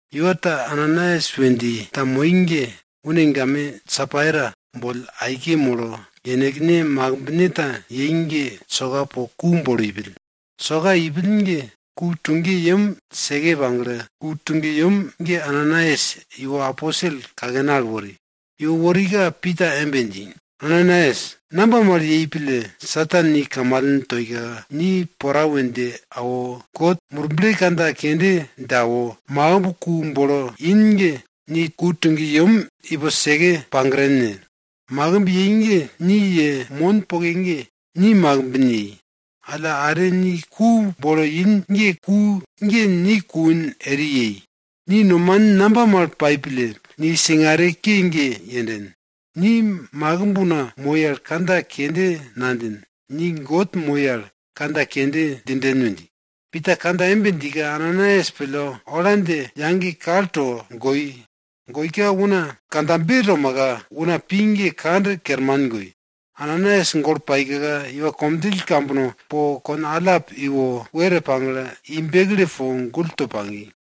Iwa ta Ananaias we dji ta moi ge une game Sapaira boll aike molo, yenekne makimbne ta yei ge soka po ku bolo ipill. Soka ipill ge ku tuge yem seke pagle, ku tuge yem ge Ananaias iwo aposel kakene al wori. Iwo worika Pita embe dji, Ananaias, namba mal yei pille Satan ni kamalen toika, ni pora we dje awo, God Murble kandja kende dje awo, makimb ku bolo in ge ni ku tuge yem ipo seke pagren ne? Makimb yei ge ni ye mon poke ge ni makimbin yei. Alla, are ni ku bolo in ge ku ge ni kuin eri yei. Ni nomanin namba mal pai pille ni singare ke ge yenden? Ni makimb una moi al kandja kende nadjin, ni God moi al kandja kende djinden we dji. Pita kandja embe djika, Ananaias pille, ola dje yage kalto goi. Goika una kandjabe tomaka, una pi ge kand kerman goi. Ananaias golo paika iwa komdjill kambono po kon allap iwo, were pagle, i bekle po gull to pagi.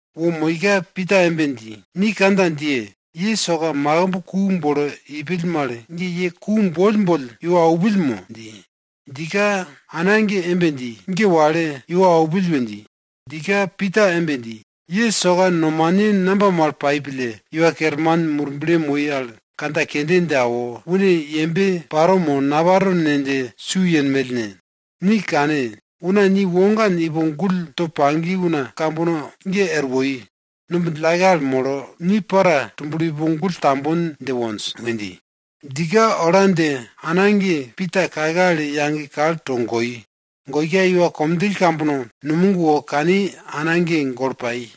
Wo moika Pita embe dji, ni kandja djiye! Ye soka makimb ku bolo ipill mal ge, ye ku boll boll iwo aupill mo? dji. Djika ana ge embe dji, ge wale, iwo aupill we dji. Djika Pita embe dji, ye soka nomane namba mal pai pille Iwa Kerman Murble moi al kandja kende dje awo, une yembe paro mo naparo ne dje su yenmell ne? Ni kane! Una ni wogan ipo gull to pagi una kambono ge er woi. Numb djillake al molo, ni para tublo ipo gull tambon dje wonj! we dji. Djika ola dje ana ge Pita kake al yage kalto goi. Goika iwa komdjill kambono numog wo kani ana ge golo pai.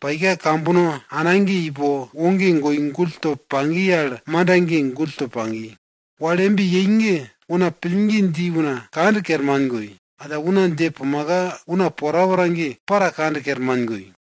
Paika kambono ana ge ipo, woge goi gull to pagi al manda ge gull to pagi. Wal embe yei ge una pillgi dji una kand kerman goi. Alla una dje pumaka una porapora ge para kand kerman goi.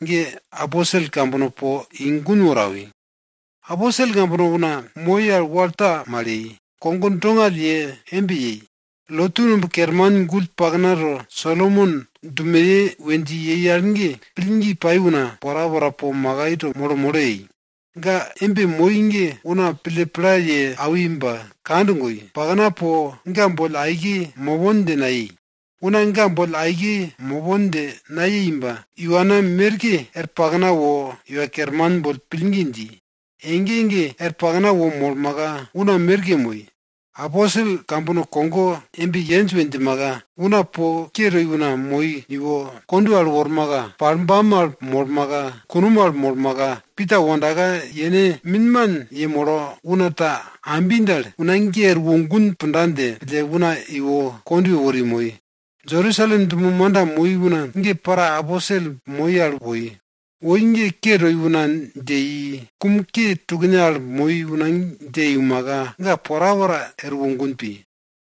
Aposel kambono po una moi al wal ta mal ye, kogo dongall ye embe yei. Lotu numb kerman gull pakna to, Solomon dumeye we dji yei al ge, pillgi pai una porapora po makai to molo molo yei. Ga embe moi ge una pille pla ye awi ba kand goi, pakna po ga boll aike mopon dje nayei. Una ga boll aike mopon dje nayei ba iwana merke er pakna wo Iwa Kerman boll pillgi dji. Ege ege er pakna wo molmaka, una merke moi. Aposel kambono kogo embe yenj we djimaka, una po ke toi una moi iwo kondwe al wormaka, palbam al molmaka, kunom al molmaka, Pita wondaka yene minman yemolo una ta ambi dal, una ge erwo gun punda dje pille una iwo kondwe wori moi. Jerusalem dumo manda moi una ge para aposel moi al woi. Woi ge ke toi una dje i, kum ke tukne al moi una dje iumaka, ga porapora erwo gun pi.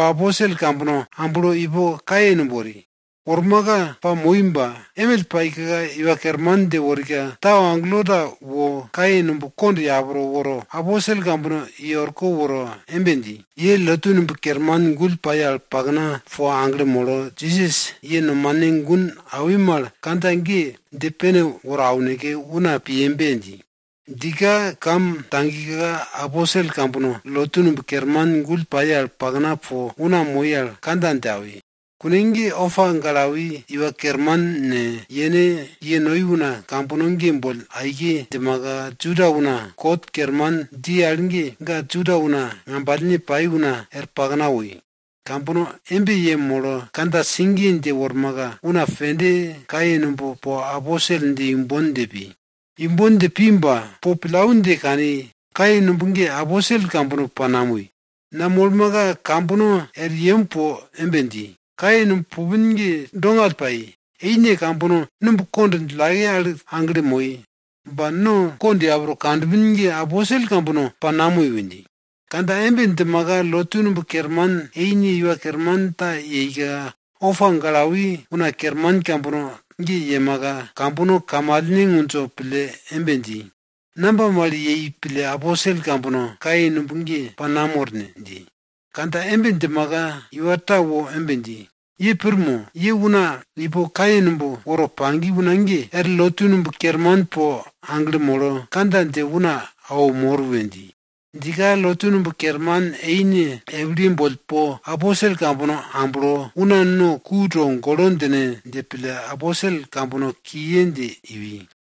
aposel kambono amblo ipo kaye numb wori. Wormaka pamoi ba, emill paika, Iwa Kerman dje worika, tau agelo ta wo kaye numb kond yapro woro, aposel kambono i orko woro embe dji, ye lotu numb kerman gull pai al pakna po aglo molo, Jisas ye nomane gun awi mal kandja ge dje pene woro auneke una piyembe! dji. Djika kam tagika aposel kambono lotu numb kerman gull pai al pakna po una moi al kandja dje awi. Kune ge opa gale awi iwa kerman ne, yene ye noi una kambono ge boll aike djimaka, Juda una kot kerman dji al ge, ga Juda una ngambalne pai una er pakna woi. Kambono embe yemolo kandja sigiye dje wormaka, una pende kaye numb po aposel dje imbon dje pi. Imbon dje pi ba, po pillau dje kani, kaye numb ge aposel kambono pa namoi. Namolmaka kambono er yem po embe dji, kaye numb pupin ge dongall pai. Eine kambono numb kond djillake al aglo moi. Ba no kond yapro kanpin ge aposel kambono pa namoi we dji. Kandja embe djimaka lotu numb kerman eine iwa kerman ta yeika, opa gale awi una kerman kambono ge yemaka, kambono kamalne ngundjo pille embe dji, namba mal yei pille aposel kambono kaye numb ge pa namor ne? dji. Kandja embe djimaka, iwa ta wo embe dji, ye pir mo! Ye una ipo kaye numb woro pagi una ge, er lotu numb kerman po aglo molo kandja dje una awo mor we dji. Djika lotu numb kerman eine epilye boll po aposel kambono amblo, una no ku togolo djine dje pille aposel kambono kiye dje iwi.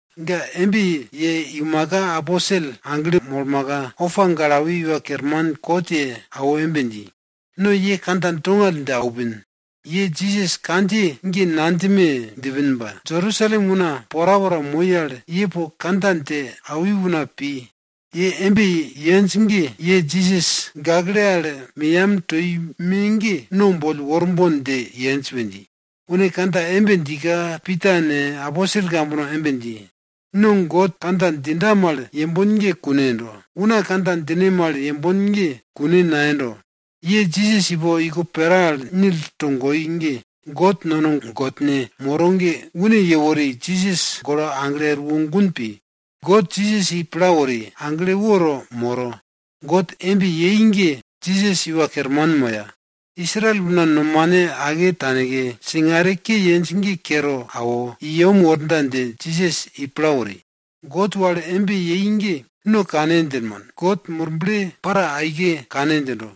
Ga embe ye iumaka aposel aglo molmaka, opa gale awi iwa kerman kot ye awo embe dji, no ye kandja dongall dje aupin. Ye Jisas kandjiye ge nadjime djipin ba, Jerusalem una porapora moi al, ye po kandja dje awi una pi. Ye embe yenj ge ye Jisas gakle al meyam toi me ge no boll worbon dje yenj we dji. Une kandja embe djika Pita ne, aposel kambono embe dji, no God kandja djinda mal yembon ge kune yendo. Una kandja djine mal yembon ge kune nayendo. Ye Jisas ipo iko pera al nil togoi ge God nono gollne godne moro ge, une yewori, Jisas golo aglo erwo gun pi. God Jisas i pla wori, agle woto moro. God embe yei ge Jisas Iwa Kerman moya, Israel una nomane ake taneke singare ke yenj ge kero awo, i yem worda dje Jisas i pla wori. God wal embe yei ge no kane djinmon. God Murble para aike kane djindo.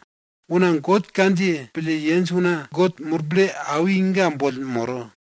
Una God kandjiye pille yenj una God Murble awi ga boll moro.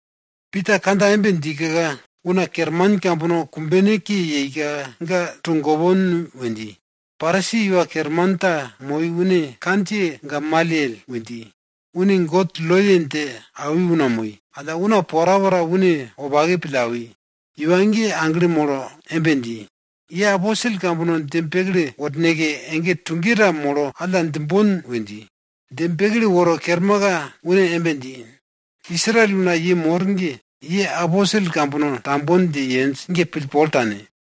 Pita kandja embe djika, una kerman kambono kumbene ke yeika ga togopon we dji. Parisi iwa kerman ta moi une kandjiye ge Gamalyel we dji. Une God loye dje awi una moi, alla una porapora une wopake pille awi. Iwa ge aglo molo embe dji, ye Aposel kambono dje bekle worneke ege tuge ta molo alla djimbon we dji. Dje bekle woro kermaka, une embe dji, Israel una ye mor ge, ye aposel kambono tambon dje yenj ge pillpol tane.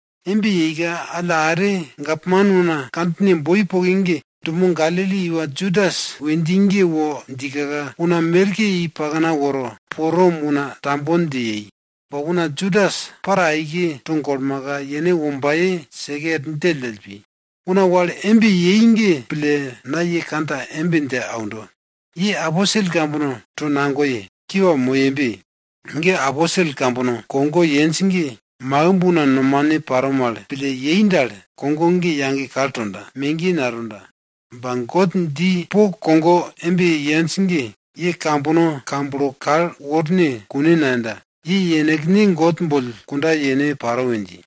Embe yeika alla are, gapman una kandjine boi poke ge, dumo Galili iwa Judas we dji ge wo djika, una merke i pakna woro po Rom una tambon dje yei. Ba una Judas para aike togolmaka yene wombaye seke er djelldjell pi. Una wal embe yei ge pille, na ye kandja embe dje aundo, ye aposel kambono tonagoye. Kiwa moyebe! Ge aposel kambono kogo yenj ge makimb una nomane paro mal pille yei dal, kogo ge yage kal tonda, megiye natonda. Ba God dji po kogo embe yenj ge, ye kambono kamblo kal worne kune nayenda. Ye yenekne God boll kunda yene paro we dji.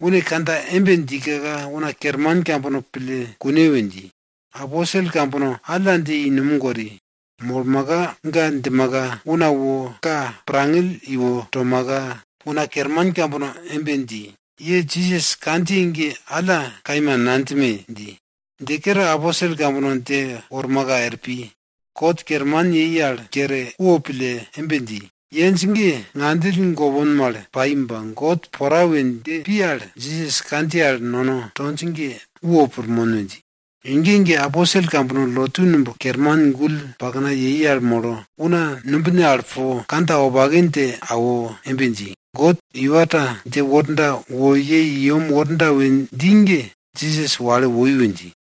Une kandja embe djika una kerman kambono pille kune we dji. Aposel kambono alla dje i numog wori. Molmaka, ga djimaka una wo ka pirngangill iwo tomaka, una kerman kambono embe dji, ye Jisas kandjiye ge alla kaima nadjime! dji. Dje kere aposel kambono dje wormaka er pi. Kot kerman yei al kere wopille embe dji, yenj ge, ngandjill gopon mal pai ba God pora we dje pi al, Jisas kandjiye al nono tonj ge wo pirmon we dji. Ege ege aposel kambono lotu numb kerman gull pakna yei al molo, una numbine al po, kandja wopake dje awo embe dji, God iwa ta dje worda wo ye i yem worda we dji ge, Jisas wale woi we dji.